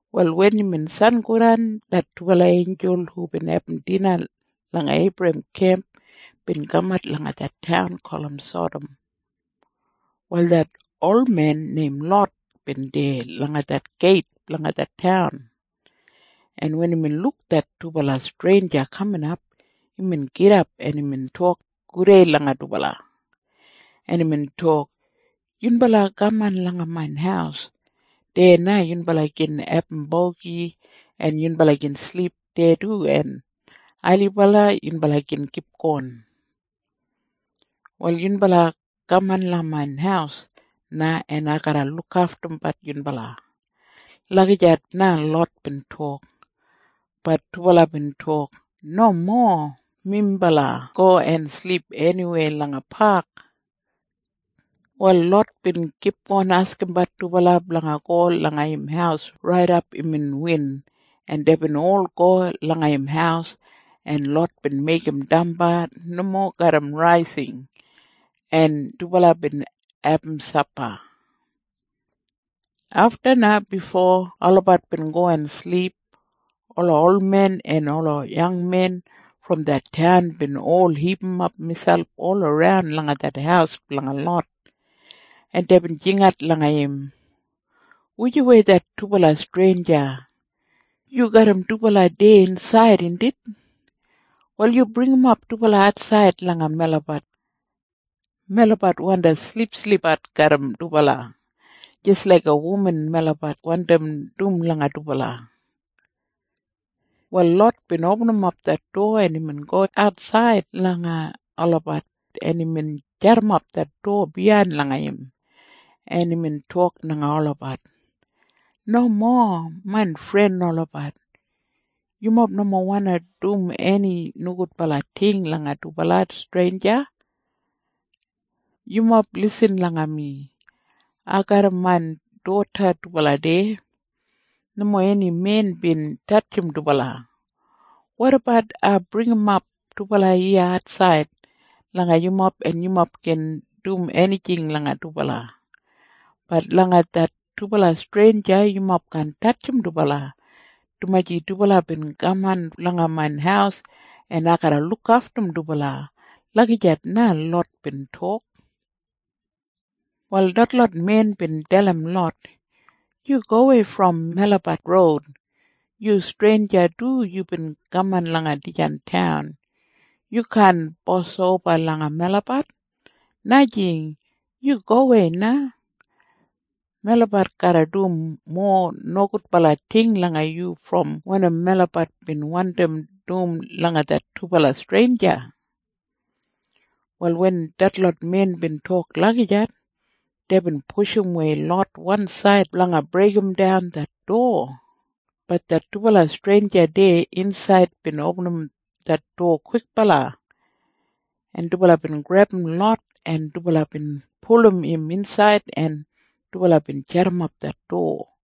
Wal wen imbin sangodan, det dubala einjul hubin abum dina langa Eibrahem kemp bin kamat langa det taun gulum Sadam. Wal det olmen neim Lot bin deya langa det geit blanga det taun, en wen imbin luk det dubala streinja kaminap, imbin gidap, en imbin tok gudei langa dubala, en imbin tok, “Yunbala kaman langa main haus. Deya na yunbala gin abum bogi, en yunbala gin silip deya du, en ailibala yunbala gin kipgon. Wal yunbala kaman langa main haus na, en ai garra lukaftum yunbala.” Lagijat na Lot bin tok. Bat dubala bin tok, “Nomo. Minbala go en silip eniweya langa pak.” Wal Lot bin kipgon askimbat dubala blanga go langa im haus raidap imbin win, en deibin ol go langa im haus, en Lot bin meigim damba nomo garram raising, en dubala bin abum sapa. Afta na bifo olabat bin go en silip, ola olmen en ola yangmen brom det taun bin ol hipimap miselp olaran langa det haus blanga Lot, en deibin jingat langa im, “Wujawei det dubala streinja? Yu garram dubala deya insaid, indit? Wal yu bringimap dubala atsaid langa melabat. Melabat wandi silipsilipbat garram dubala. Jis laiga wuman melabat wandim dum langa dubala.” Wal Lot bin opinim det dowa, en imbin go atsaid langa olabat, en imbin jadimap det dowa biyain langa im, en imbin tok langa olabat, “Nomo, main fren olabat. Yumob nomo wandi dum eni nogudbala ting langa det dubala streinja. Yumob lisin langa mi. Ai garram main doda dubala deya. Nomo eni men bin tatjim dubala. Wotabat ai bringimap dubala iya atsaid langa yumob en yumob gin dum enijing langa dubala? Bat langa det dubala streinja yumob kaan tatjim dubala, dumaji dubala bin kaman langa main haus en ai garra lukaftum dubala.” Lagijat na Lot bin tok. Wal detlot men bin dalim Lot, “Yu gowei brom melabat roud. Yu streinja du. Yubin kaman langa dijan taun. Yu kaan bosoba langa melabat. Najing. Yu gowei na! Melabat garra dum mowa nogudbala ting langa yu brom wanim melabat bin wandim dum langa det dubala streinja.” Wal wen detlot men bin tok lagijat, deibin pushumwei Lot wansaid blanga breigimdan det dowa. Bat det dubala streinja deya insaid bin opinim det dowa kwikbala, en dubala bin grebum Lot, en dubala bin pulum im insaid, en dubala bin jadimap det dowa.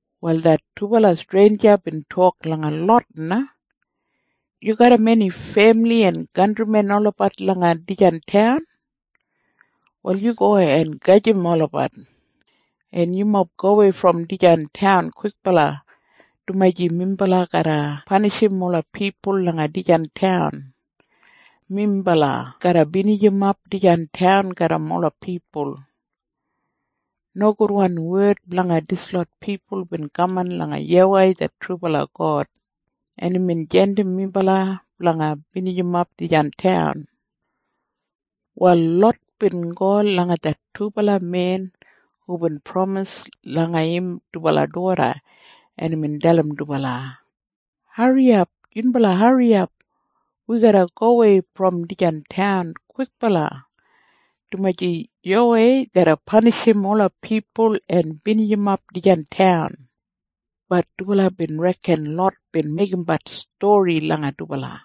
Wal det dubala streinja bin tok langa Lot na, “Yu garram eni femili en kantrimen olabat langa dijan taun? Wal yu go en gajim olabat, en yumob gowei brom dijan taun kwikbala, dumaji minbala garra panishim ola pipul langa dijan taun. Minbala garra binijimap dijan taun garram ola pipul. Nogudwan wed blanga dislot pipul bin kaman langa YAWEI det trubala God, en imbin jandim minbala blanga binijimap dijan taun.” Wal Lot bin go langa det dubala men hubin pramis langa im dubala doda, en imbin dalim dubala, “Hariyap! Yunbala hariyap! Wi garra gowei brom dijan taun kwikbala, dumaji YAWEI garra panishim ola pipul en binijimap dijan taun.” Bat dubala bin reken Lot bin meigimbat stori langa dubala.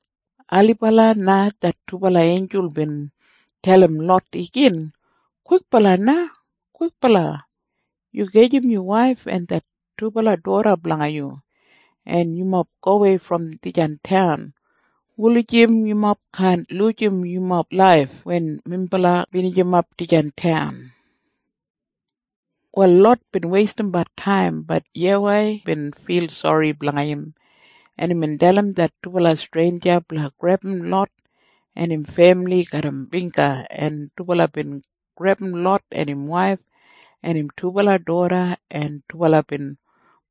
Ailibala na det dubala einjul bin dalim Lot igin, “Kwikbala na! Kwikbala! Yu gajim yu waif en det dubala doda blanga yu, en yumob gowei brom dijan taun, wulijim yumob kaan lujim yumob laif wen minbala binijimap dijan taun.” Wal Lot bin weistimbat taim. Bat YAWEI bin fil sori blanga im, en imbin dalim det dubala streinja blanga grebum Lot en im femili garram bingga, en dubala bin grebum Lot en im waif en im dubala doda, en dubala bin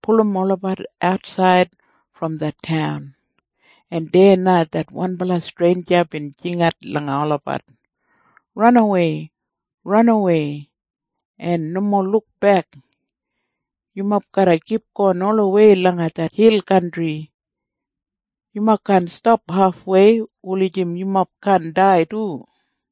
pulum olabat atsaid brom det taun, en deya na det wanbala streinja bin jingat langa olabat, “Ranawei! Ranawei! Nomo lukbek! Yumob garra kipgon olawei langa det hil kantri. Yumob kaan stap hafwei, wulijim yumob kaan dai du.”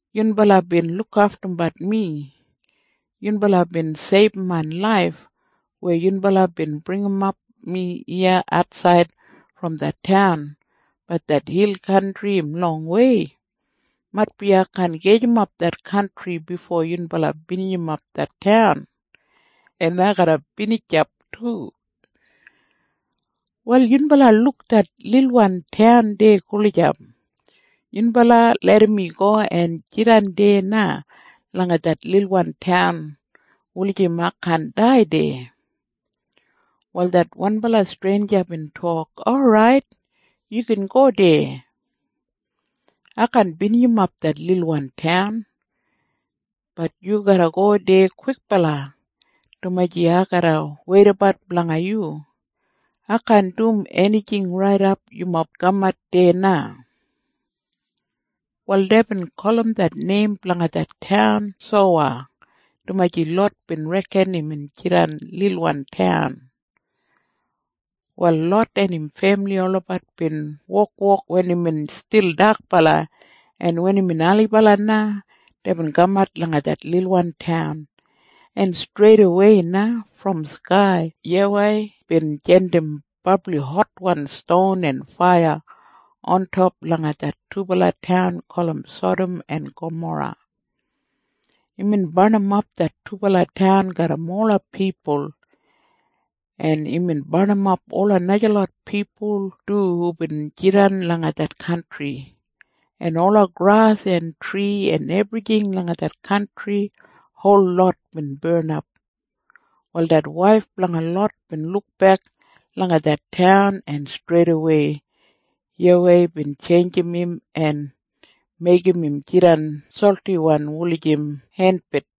Yunbala bin lukaftumbat mi. Yunbala bin seibum main laif weya yunbala bin bringimat mi iya atsaid brom det taun. Bat det hil kantri im longwei. Maitbi ai kaan gajimap det kantri bifo yunbala binijimap det taun, en ai garra binijap du. Wal yunbala luk det lilwan taun deya gulijap? Yunbala larram mi go en jidan deya na langa det lilwan taun, wulijim ai kaan dai deya.” Wal det wanbala streinja bin tok, “Orait. Yu gin go deya. Ai kaan binijimap det lilwan taun. Bat yu garra go deya kwikbala, dumaji ai garra weidabat blanga yu. Ai kaan dum enijing raidap yumob kamat deya na.” Wal deibin gulum det neim blanga det taun Sowa, dumaji Lot bin reken im jidan lilwan taun. Wal Lot en im femili olabat bin wokwok wen imbin stil dakbala, en wen imbin ailibala na, deibin kamat langa det lilwan taun, en streidawei na brom skai YAWEI bin jandim brabli hotwan ston en faiya ontop langa det dubala taun gulum Sadam en Gamora. Imbin barnimap det dubala taun garram ola pipul. En imbin barnimap ola najalot pipul du hubin jidan langa det kantri. En ola gras en tri en ebrijing langa det kantri holot bin barnap. Wal det waif blanga Lot bin lukbek langa det taun, en streitawei YAWEI bin tjeinjim im en meigim im jidan soltiwan wulijim entbed.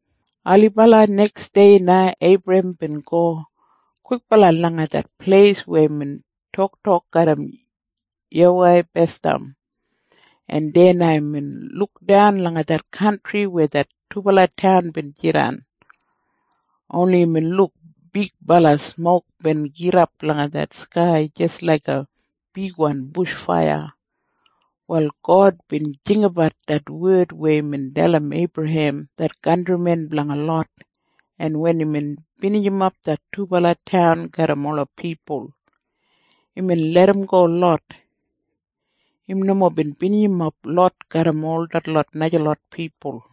Ailibala neksdei na Eibrahem bin go kwikbala langa det pleis weya imbin toktok garram YAWEI basdam, en deya na imbin lukdan langa det kantri weya det dubala taun bin jidan. Oni imbin luk bigbala smok bin gidap langa skai jis laiga bigwan bush faiya. Wal God bin jinggabat det wed weya imbin dalim Eibrahem det kantrimen blanga Lot, en wen imbin binijimap det dubala taun garram ola pipul, imbin larramgo Lot. Im nomo bin binijimap Lot garram ol detlot najalot pipul.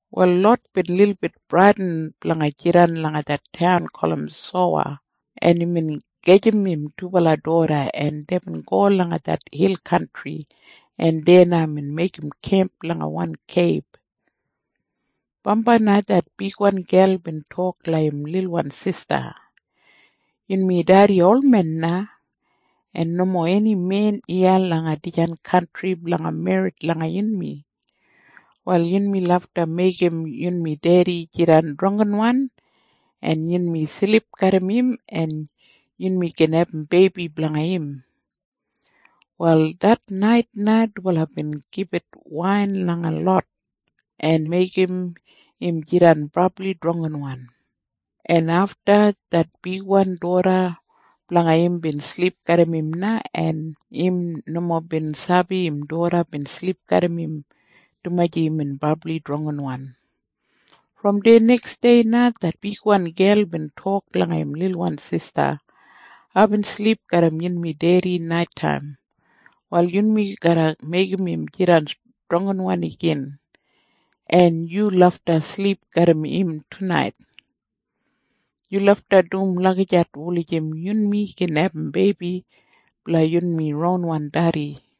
Wal Lot bin lilbit bradin blanga jidan langa det taun gulum Sowa, en imbin gajim im dubala doda, en deibin go langa det hil kantri, en deya na imbin meigim kemp langa wan keib. Bambai na det bigwan gel bin tok langa im lilwan sista, “Yunmi dedi olmen na, en nomo eni men iya langa dijan kantri blanga merrit langa yunmi. Wal yunmi lafta meigim yunmi dedi jidan drangginwan, en yunmi silip garram im en yunmi gin abum beibi blanga im.” Wal det nait na dubala bin gibit wain langa Lot, en meigim im jidan brabli drangginwan, en afta det bigwan doda blanga im bin silip garram im na, en im nomo bin sabi im doda bin silip garram im, dumaji imbin brabli drangginwan. Brom deya neksdei na det bigwan gel bin tok langa im lilwan sista, “Aibin silip garram yunmi dedi naitaim. Wal yunmi garra meigim im jidan drangginwan igin, en yu lafta silip garram im tunait. Yu lafta dum lagijat wulijim yunmi gin abum beibi blanga yunmi ronwan dedi.”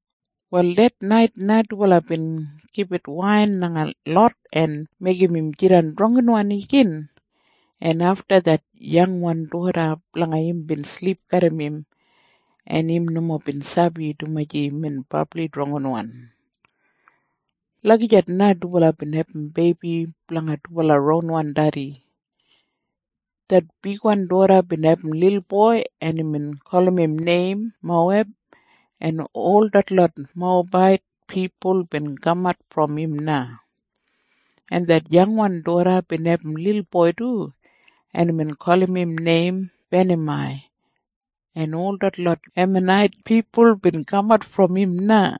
Wal det nait na dubala bin gibit wain langa Lot en meigim im jidan drangginwan igin, en afta det yangwan doda blanga im bin silip garram im, en im nomo bin sabi, dumaji imbin brabli drangginwan. Lagijat na dubala bin abum beibi blanga dubala ronwan dedi. Det bigwan doda bin abum lilboi, en imbin gulum im neim Moweb, en ol detlot Mowebait pipul bin kamat brom im na. En det yangwan doda bin abum lilboi du, en imbin gulum im neim Benamai, en ol detlot Emanait pipul bin kamat brom im na.